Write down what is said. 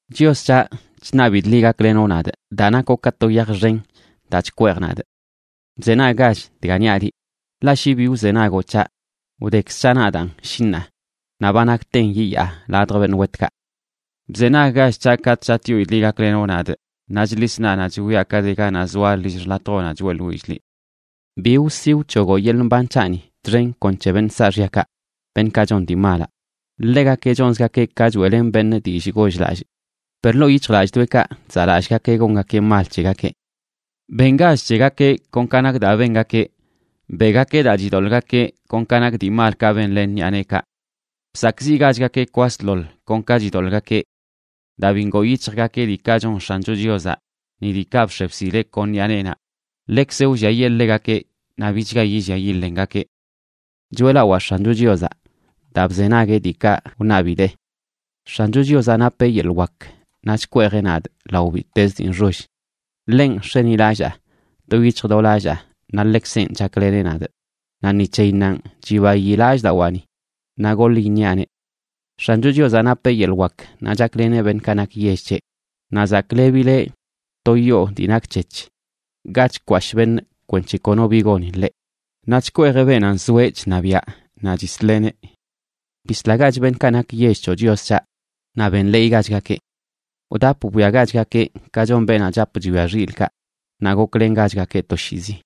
Chios c̱haꞌ, chṉabidꞌ liꞌ gaklenoꞌ nadꞌ daa nakoꞌ ka to yaj xen daa chkweej nadꞌ. Bzenaggach dga niaꞌ liꞌ. Ḻaꞌ shi bi wzenagoꞌ c̱haꞌ, wdekz c̱haꞌ nadaan, shi ṉaa, naꞌ ba nakten yiyaa ladj beṉꞌ wetkaꞌ. Bzenaggach c̱haꞌ katꞌ chatꞌyoidꞌ liꞌ gaklenoꞌ nadꞌ naꞌ chḻis naꞌnaꞌ chwiaꞌ ka de ganaꞌ zoalə lill xḻatjoꞌnaꞌ choeꞌḻwillꞌ liꞌ. Bi wsi wc̱hogoꞌ yeḻꞌ mban c̱haꞌni txen kon c̱he beṉꞌ saaxyakaꞌ, beṉꞌkaꞌ chon dii malaꞌ. Ḻegakeꞌ chonzgakeꞌ ka choeꞌlen beṉꞌ dillꞌ goll-lallꞌ, per ḻoo yic̱hjlallꞌdoꞌekaꞌ chzaꞌlallꞌgakeꞌ gongakeꞌ mal c̱hegakeꞌ. Bengach c̱hegakeꞌ kon ka nak daa bengakeꞌ; beꞌgakeꞌ daa chidoḻꞌgakeꞌ kon ka nak dii malkaꞌ benlen ṉiꞌa neekaꞌ. Bsakꞌziꞌgachgakeꞌ kwasḻoḻ kon ka chidoḻꞌgakeꞌ. Daa bi ngoo yic̱hjgakeꞌ diikaꞌ chon X̱ancho Chiozaꞌ, ni diikaꞌ bx̱e bsileꞌ kon ṉiꞌa neenaꞌ, ḻekzeꞌ wlliayee ḻegakeꞌ naꞌ bichga yillia yilengakeꞌ. ¡Choeꞌlawaa X̱ancho Chiozaꞌ, daa bzenagueꞌ diikaꞌ wṉabidee! X̱ancho Chiozaꞌ napeꞌ yeḻꞌ wak naꞌ chkweejeꞌ nadꞌ lao bittezə dii nxoll; ḻenꞌ nx̱enilallaa do yic̱hj do lallaa naꞌ ḻekzenꞌ chakleneꞌ nadꞌ. Naꞌ ni c̱heyinnanꞌ chibayi lallꞌdawaani, naꞌ goḻ iṉiaꞌneꞌ. X̱ancho Chiozaꞌ napeꞌ yeḻꞌ wak naꞌ chakleneꞌ beṉꞌkaꞌ nak yell c̱heꞌ; naꞌ zaklebileꞌ to yoo dii nakc̱hec̱h ga chkwashꞌ beṉꞌ kwenc̱he kono bi goni ḻeꞌ, naꞌ chkweejeꞌ beenaꞌ nzoeꞌ chṉabiaꞌ naꞌ chisleꞌneꞌ. Bislagach beṉꞌkaꞌ nak yell c̱hoꞌ, Chios c̱haꞌ, naꞌ benḻeeygachgakeꞌ. Wdap bwiagachgakeꞌ, ka chon beenaꞌ chap chwia xilꞌkaꞌ, naꞌ goklengachgakeꞌ toshiizi.